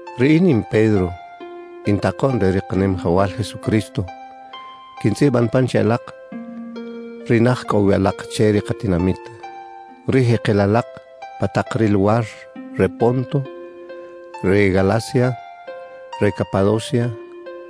Riꞌin in Pedro, in takoꞌn re ri Kanimajawal Jesucristo. Quintzꞌiban pan che alak, ri naj cꞌo wi alak che ri katinamit, ri jekel alak pa tak ri luwar re Ponto, re Galacia, re Capadocia,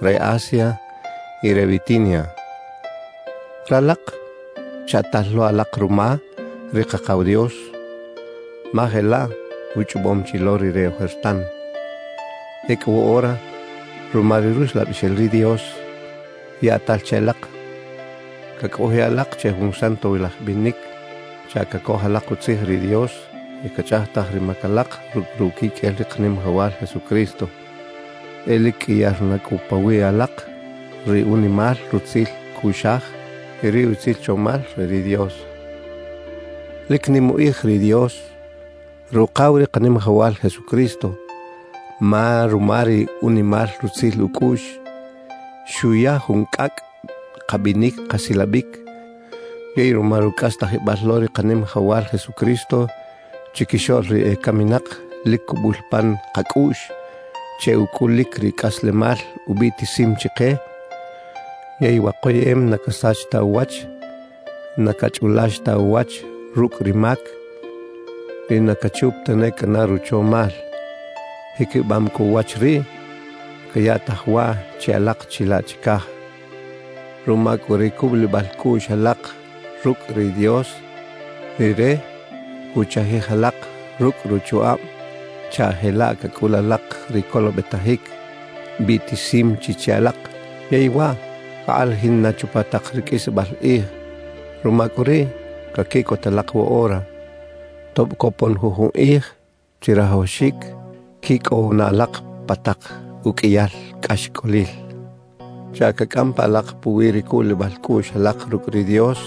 re Asia y re Bitinia. Ralak chaꞌtal lo alak ruma ri Kakaw Dios, ma jelaꞌ uchꞌobom chi lo Rire ojertan. Ecꞌu woꞌora, ruma ri Ruxlabixel ri Dios, yaꞌtal che alak cacꞌojiꞌ alak che jun santowilaj binic chaꞌ cacoj alak utzij ri Dios y cachꞌajtaj ri mac alak rucꞌ ruquiqꞌuel ri Kanimajawal Jesucristo. E lic qꞌuiyar na cꞌu pawiꞌ alak ri unimal rutzil cꞌuꞌxaj y ri utzil chomal re ri Dios. Lic nim ukꞌij ri Dios, Rukaw ri Kanimajawal Jesucristo, ma ruma ri unimal rutzil ucꞌuꞌx xuya jun cꞌacꞌ kabinic kasilabic. Yey ruma rucꞌastajibal lo ri Kanimajawal Jesucristo chiquixoꞌl ri ecaminak, lic cubul pan kacꞌuꞌx che ucꞌulic ri cꞌaslemal ubiꞌtisim chike. Yey wa koyeꞌem na casach ta uwach, na cachꞌulax ta uwach rucꞌ ri mac y na cachup tane cꞌana ruchomal. Jiquibam cꞌu uwach riꞌ cayaꞌtaj waꞌ che alak chilaꞌ chicaj. Ruma cꞌu ri cubulibal cꞌuꞌx alak rucꞌ ri Dios, Rire cuchajij alak rucꞌ ruchukꞌab chaꞌ jelaꞌ cacꞌul alak ri colobetajic biꞌtisim chi che alak yey waꞌ cakꞌalajin na chupa tak ri qꞌuisbal kꞌij. Ruma cꞌu riꞌ, caquiꞌcot alak woꞌora, tob copon jujun kꞌij chirajawaxic quicꞌow na alak pa tak uqꞌuiyal cꞌaxcꞌolil chaꞌ cacꞌam pa alak puwi ri cubulibal cꞌuꞌx alak rucꞌ ri Dios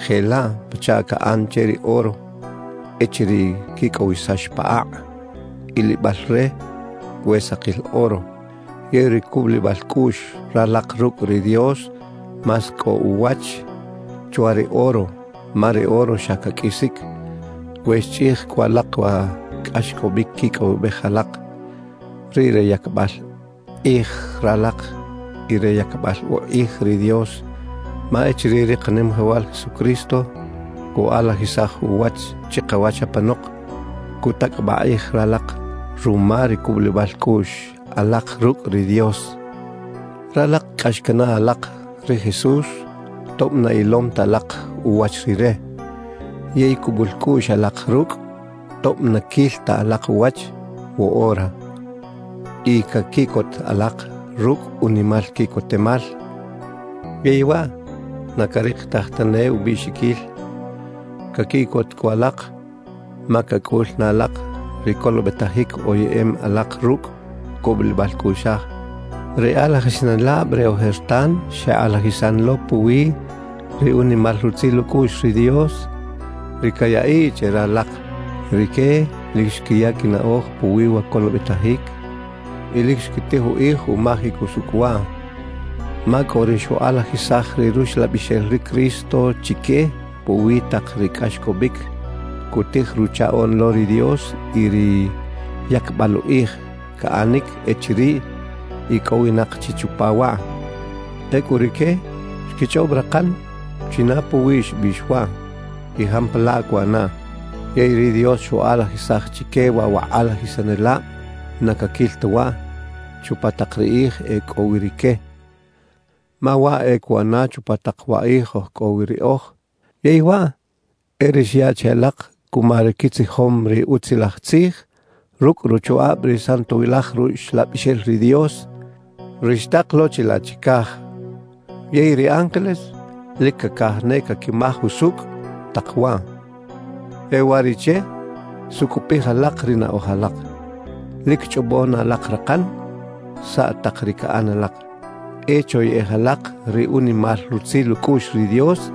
jelaꞌ pachaꞌ caꞌan che ri oro echiriꞌ quicꞌowisax pa akꞌ, ilibal re we sakil oro. Yey ri cubulibal cꞌuꞌx ralak rucꞌ ri Dios más cꞌo uwach chwa ri oro, ma ri oro xa caqꞌuisic. We xchꞌij cꞌu alak wa cꞌaxcꞌobic quicꞌowibej alak, riꞌ re yacbal kꞌij ralak y re yacbal ukꞌij ri Dios. Ma echiriꞌ ri Kanimajawal Jesucristo cukꞌalajisaj uwach chikawach apanok, cutacꞌabaꞌ kꞌij ralak ruma ri cubulibal cꞌuꞌx alak rucꞌ ri Dios. Ralak cꞌax canaꞌ alak ri Jesús tob na ilom ta alak uwach Rire, yey cubul cꞌuꞌx alak rucꞌ tob na quil ta alak uwach woꞌora. Y caquiꞌcot alak rucꞌ unimal quiꞌcotemal, yey waꞌ na carikitaj tane ubiꞌxiquil. Caquiꞌcot cꞌu alak, ma cacꞌul na alak ri colobetajic oyeꞌem alak rucꞌ cubulibal cꞌuꞌxaj. Ri kꞌalajisanelab re ojertan xekꞌalajisan lo puwi ri unimal rutzil ucꞌuꞌx ri Dios, ri cayaꞌiꞌ che ralak. Rique lic xquiya quinaꞌoj puwi wa colobetajic y lic xquitij ukꞌij umajic usucꞌ waꞌ. Ma cꞌo ri xukꞌalajisaj ri Ruxlabixel ri Cristo chique puwi tak ri cꞌaxcꞌobic cutij Ruchaꞌoꞌn lo ri Dios y ri yacbal ukꞌij caꞌanic echiriꞌ icꞌowinak chi chupa waꞌ. Ecꞌu rique xquichꞌob rakan china puwiꞌ xbiꞌx waꞌ y jampalaꞌ cuꞌanaꞌ. Yey ri Dios xukꞌalajisaj chique waꞌ wa kꞌalajisanelab na caquil ta waꞌ chupa tak ri kꞌij e cꞌo wi rique, ma waꞌ e cuꞌana chupa tak wa kꞌij oj cꞌo wi riꞌoj. Yey waꞌ e ri xyaꞌ che alak cuma ri quitzijom ri Utzilaj Tzij rucꞌ ruchukꞌab ri Santowilaj Ruxlabixel ri Dios, ri xtak lo chilaꞌ chicaj. Yey ri ángeles lic cacaj ne caquimaj usucꞌ tak waꞌ. E uwariꞌche sucꞌupij alak ri naꞌoj alak, lic chꞌobo na alak rakan saꞌ tak ri caꞌan alak. E choyeꞌej alak ri unimal rutzil ucꞌuꞌx ri Dios,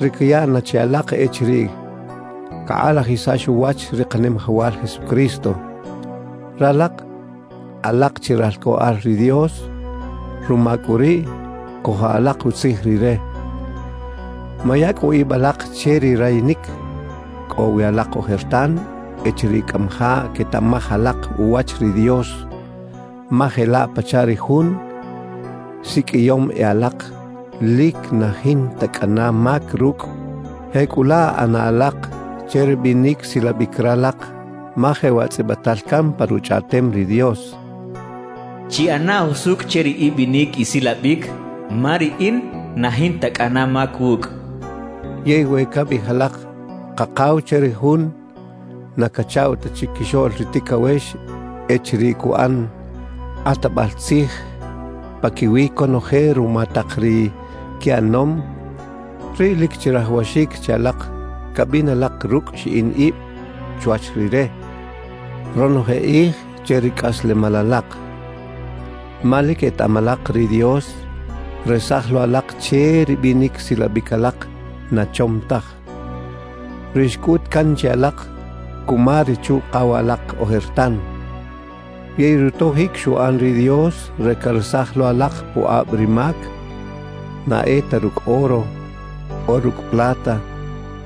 ri cayaꞌ na che alak echiriꞌ cakꞌalajisax uwach ri Kanimajawal Jesucristo. Ralak alak chi ralcꞌoꞌal ri Dios, ruma cꞌu riꞌ cojo alak utzij Rire. Maya cꞌu ib alak che ri rayinic cꞌo wi alak ojertan echiriꞌ cꞌamajaꞌ quetaꞌmaj alak uwach ri Dios. Ma jelaꞌ pachaꞌ ri Jun siqꞌuiyom e alak lic na jinta cꞌana mac rucꞌ, jecꞌulaꞌ ꞌana alak che ri binic silabic ralak. Ma jewaꞌ tzꞌibital can pa Ruchꞌaꞌtem ri Dios: Chiꞌana jusucꞌ che ri ibinic isilabic, ma Riꞌin na jinta cꞌana mac wucꞌ. Yey we cabiꞌij alak «Kakaw» che ri Jun na cachaꞌw ta chiquixoꞌl ri ticawex echiriꞌ cuꞌan kꞌatbal tzij paquiwi conoje ruma tak ri quiꞌanom, riꞌ lic chirajawaxic che alak cabin alak rucꞌ xiꞌin ib chwach Rire ronoje kꞌij che ri cꞌaslemal alak. Ma lic etaꞌam alak, ri Dios xresaj lo alak che ri binic silabic alak na chom taj, ri xcꞌut can che alak cuma ri chuꞌkaw alak ojertan. Yey rutojic xuꞌan ri Dios re caresaj lo alak pukꞌab ri mac, na e ta rucꞌ oro o rucꞌ plata,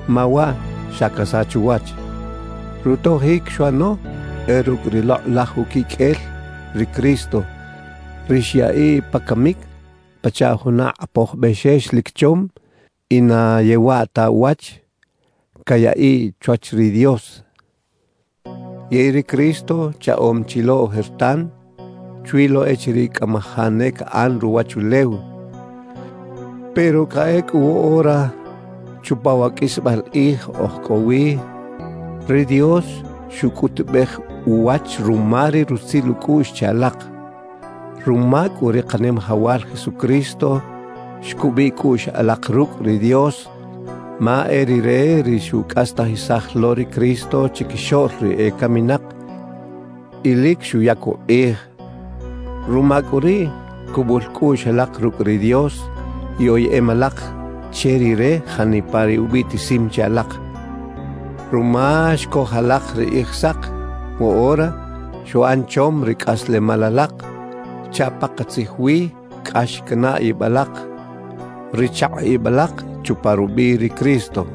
ma waꞌ xa casach uwach; rutojic xuꞌano e rucꞌ ri lokꞌlaj uquiqꞌuel ri Cristo, ri xyaꞌiꞌ pa camic pachaꞌ juna kꞌapoj bexex lic chom y na yewaꞌ ta uwach cayaꞌiꞌ chwach ri Dios. Yey ri Cristo chaꞌom chi lo ojertan chwi lo echiriꞌ cꞌamajaꞌ ne caꞌan ruwachulew; pero cꞌa ecꞌu woꞌora chupa wa qꞌuisbal kꞌij oj cꞌo wi, ri Dios xucꞌutubej uwach ruma ri rutzil ucꞌuꞌx che alak. Ruma cꞌu ri Kanimajawal Jesucristo, xcubiꞌ cꞌuꞌx alak rucꞌ ri Dios, ma e Rire ri xucꞌastajisaj lo ri Cristo chiquixoꞌl ri ecaminak y lic xuyac ukꞌij. Ruma cꞌu riꞌ, cubul cꞌuꞌx alak rucꞌ ri Dios y oyeꞌem alak che Rire janipa ri ubiꞌtisim che alak. Ruma xcoj alak ri Kꞌijsak, woꞌora xuꞌan chom ri cꞌaslemal alak chaꞌ pakatzij wi cꞌax canaꞌ ib alak ri chakꞌ ib alak chupa rubiꞌ ri Cristo.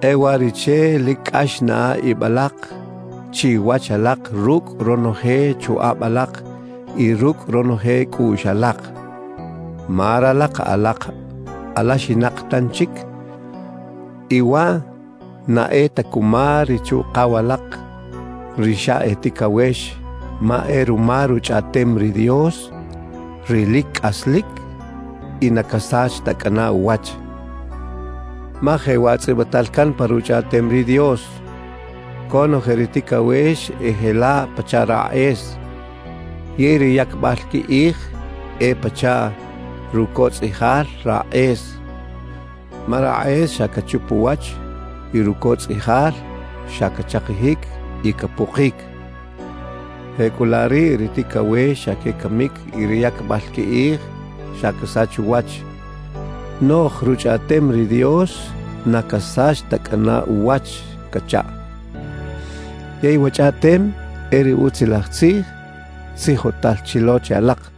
E uwariꞌche lic cꞌax naꞌa ib alak chiwach alak rucꞌ ronoje chukꞌab alak y rucꞌ ronoje cꞌuꞌx alak. Ma ralak alak alaxinak tanchic y waꞌ na e ta cuma ri chuꞌkaw alak ri xa e ticawex, ma e ruma Ruchꞌaꞌtem ri Dios, ri lic cꞌaslic y na casach ta cꞌana uwach. Ma jewaꞌ tzꞌibital can pa Ruchꞌaꞌtem ri Dios: Conoje ri ticawex e jelaꞌ pachaꞌ rakꞌes yey ri yacbal quikꞌij e pachaꞌ rucotzꞌiꞌjal rakꞌes; ma rakꞌes xa cachup uwach y rucotzꞌiꞌjal xa cachakijic y capukic. Jecꞌulaꞌ riꞌ ri ticawex xa quecamic y ri yacbal quikꞌij xa casach uwach, noꞌj Ruchꞌaꞌtem ri Dios na casach ta cꞌana uwach cachaꞌ. Yey wa chꞌaꞌtem e ri Utzilaj Tzij tzijotal chi lo che alak.